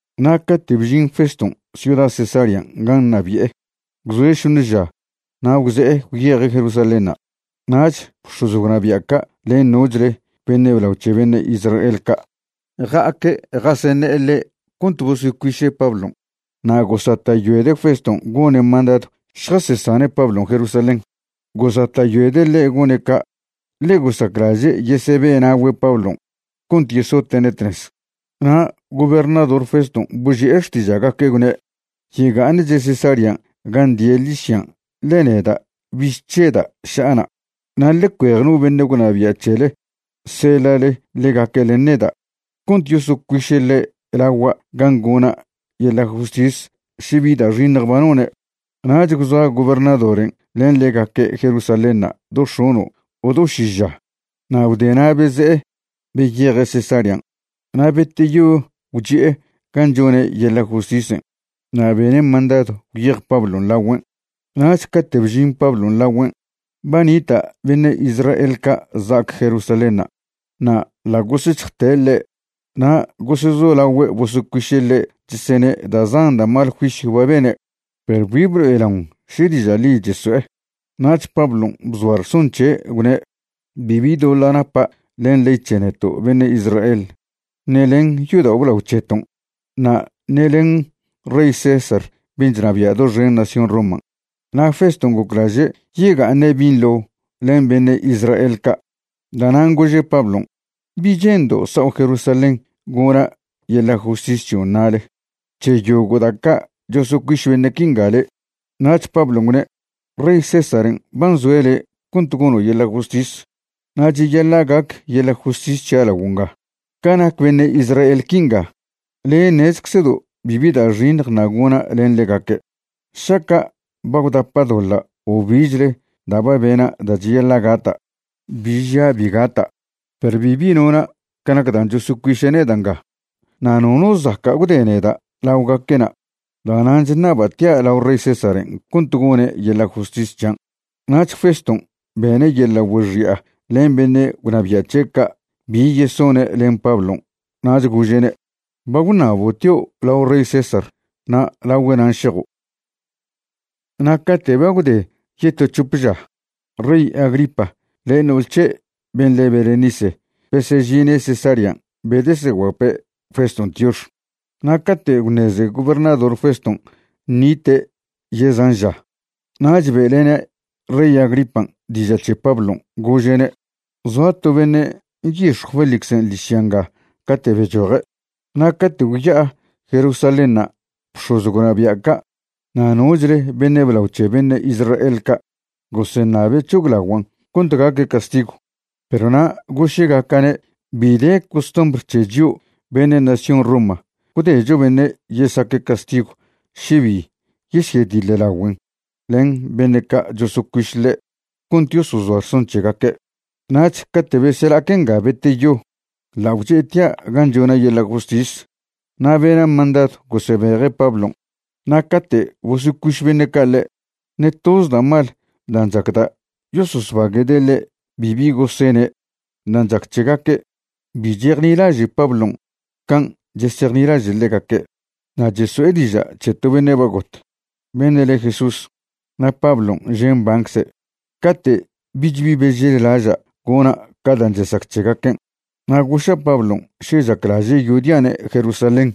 Na' cate' bžin Feston' ciuda Cesarean' gan' ṉabi'e, gwzoe' šoṉe ža na' gwze'e gwyeje' Jerusalénṉa'. Nach bx̱oz gwnabia' ca' len nochle beṉe' blao c̱he beṉe' Israel ca' ja'aque' jaseṉe'e ḻe' cont bosocuiše' Pablon'. Na' gosata'yoede' Feston' gone' mandadw šjasesane' Pablon' Jerusalén. Gosata'yoede' ḻe' gone' ca' ḻe gosaclaže' yesebe'na'ogüe' Pablon' cont yesote'ne' tnez. Na' gobernador Feston' boži'e xtiža'gaque', gwne': ―Yega'aṉche' Cesarean' gan' die' ḻižyan' ḻe neda' bich chžeda' ša'a na'. Na' ḻe cuej no beṉe' gwnabia' c̱hele seḻa'le ḻegaque' len neda' cont yosocuiše' ḻe' lagua' gan' gona' yeḻa' justis še bi da' xiṉj ba none'. Nach gwzoa gobernadoren' len ḻegaque' Jerusalénṉa' do x̱ono' o do ši ža na' gwdena' beze'e beyeje' Cesarean'. Na' beteyo gwchi'e gan' chone' yeḻa' justisen' na' bene' mandadw gwyej Pablon' lagüen'. Nach cate' bžin Pablon' lagüen' ba nita' beṉe' Israel ca' za'ac Jerusalénṉa' na' ḻa' gosec̱hjte' ḻe' na' gosezolagüe' bosocuiše' ḻe' chesene' da' zan da' mal juisyw ba bene', perw bi blo'elaon še diža' ḻi cheso'e. Nach Pablon' bzoa rson c̱he', gwne': ―Bibi doḻa' napa' len ley c̱he neto' beṉe' Israel ṉe len yodao' blao c̱heton' na' ṉe len rey César ben' chnabia' doxen nación Roman'. Na' Feston' goclaže' yega'aṉe' binḻo len beṉe' Israel ca', da'nan' gože' Pablon': ―¿Bi che'ndo' sao' Jerusalén gona' yeḻa' justis c̱hion' na'le c̱he yogo' da' ca' chosocuiš beṉe' quinga le'? Nach Pablon' gwne': ―Rey Césaren' ba nzoe' le' cont gono' yeḻa' justis, na' cheyaḻa' gac yeḻa' justis c̱hia' laguo' nga. Ca nac beṉe' Israel quinga, le' ṉezczedo' bibi da' xiṉj ṉa' gona' ḻen ḻegaque'. Šaca' ba gwdapa' doḻa' o bichle da' ba bena' da' cheyaḻa' gata', bi žia' bi gata'. Perw bibi nona' ca nac dan' chosocuiše' neda' nga, na' nono zaca' gwde neda' laogaque'na'. Da'nan' chṉaba' tia' lao rey Césaren' cont gone' yeḻa' justis c̱hian'. Nach Feston' bene' yeḻa' güexi'a len beṉe' gwnabia' c̱he' ca' bi yesone' len Pablon' nach gože'ne': ―Ba gwṉabo' tio' lao rey César na' lagüe' nan' šejo'. Na' cate' ba gwde yeto c̱hope ža, rey Agripa len no'ol c̱he' ben' le Berenice besežine' Cesarean' bedeseguape' Feston' tiox. Na' cate' gwṉeze gobernador Feston' ṉite' yezan ža, nach be'lene' rey Agripan' diža' c̱he Pablon', gože'ne': ―Zoa to beṉe' nyix̱jw Félixen' ḻižya nga cate' bechoje'. Na' cate' gwya'a Jerusalénṉa' bx̱oz gwnabia' ca' na' nochle beṉe' blao c̱he beṉe' Israel ca' goseṉabe' c̱hoglaguan' cont gaque' castigw. Perw na' goše'gaca'ne' bi de costumbr c̱he chio' beṉe' nación Roma gwdecho beṉe' yesaque' castigw še bi yesyediḻlagüen' len beṉe' ca' chosocuiš ḻe' cont yosozoa rson c̱hegaque'. Nach cate' besela'aque' nga beteyo ḻa' gwche'tia' gan' chona' yeḻa' justis na' bena' mandadw gosebeje' Pablon'. Na' cate' bosocuiš beṉe' ca' ḻe', ṉe toz da' mal dan' chacda' yososbague'de' ḻe' bibi gosene'. Dan' chac c̱hegaque', bi chejnilaže' Pablon' can' chesejnilaže' ḻegaque', na' cheso'e diža' c̱he to beṉe' ba got, beṉe' le Jesús, na' Pablon' že' mbancze'. Cate' bich bi bežellaža' gona' ca dan' chesac c̱hegaquen' na' goša' Pablon' še chaclaže' yodia'ne' Jerusalén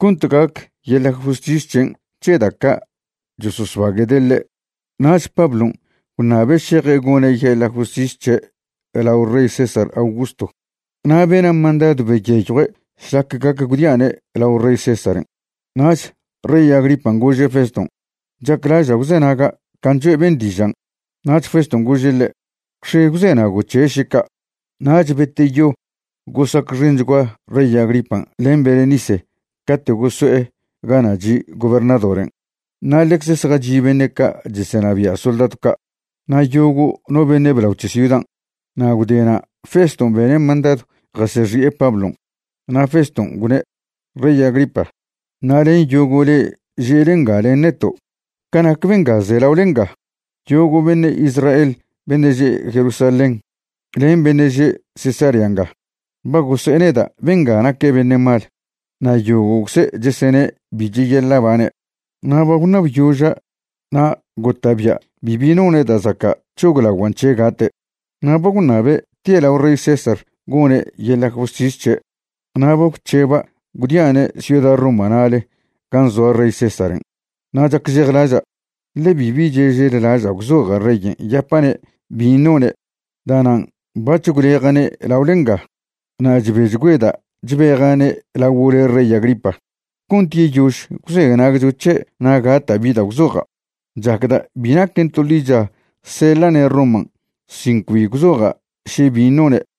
cont gac yeḻa' justis c̱hen' c̱he da' ca' chososbague'de' ḻe'. Nach Pablon' gwṉabe' šeje' gone' yeḻa' justis c̱he' lao rey César Augusto, na' bena' mandadw beyeyjue' šlac gac gwdia'ne' lao rey Césaren'. Nach rey Agripan' gože' Feston': ―Chaclaža' gwzenaga' can' choe' ben' dižan'. Nach Feston' gože' ḻe': ―Gwx̱e gwzenago' c̱he' šeca'. Nach beteyo gosacxenchgua rey Agripan' len Berenice cate' goso'e gana' chi' gobernadoren', na' ḻecz zjachi' beṉe' ca' chesenabia' soldadw ca' na' yogo' no beṉe' blao c̱he ciudan'. Na' gwdena' Feston' bene' mandadw jasexi'e Pablon'. Na' Feston' gwne': ―Rey Agripa, na' len yogo' le'e že'le nga len neto', ca nac benga ze laole nga, yogo' beṉe' Israel beṉe' že' Jerusalén len beṉe' že' Cesarea nga ba gose'e neda' benga naque' beṉe' mal na' yogo'cze' chesene' bi cheyaḻa' bane'. Na' ba gwṉabyoža' na' gota'bia' bibi none' da' zaca' c̱hoglaguan' c̱he' gate'. Na' ba gwṉabe' tie' lao rey César gone' yeḻa' justis c̱he', na' ba gwc̱heba' gwdia'ne' ciuda Roma na'ale gan' zoa rey Césaren'. Na' chacžejlaža', ḻe bibi chežellaža' gwzoja' reyen' yapa'ne' bin' none'. Da'nan' bac̱h gwleja'ne' laole nga, na' chbechgüeda' chbeja'ne' laguo' le' rey Agripa, cont yeyož gwzenagcho c̱he' na' gata' bi da' gwzoja'. Chacda' bi naquen to ḻicha seḻa'ne' Roman' sin cbi gwzoja' še bin' none'.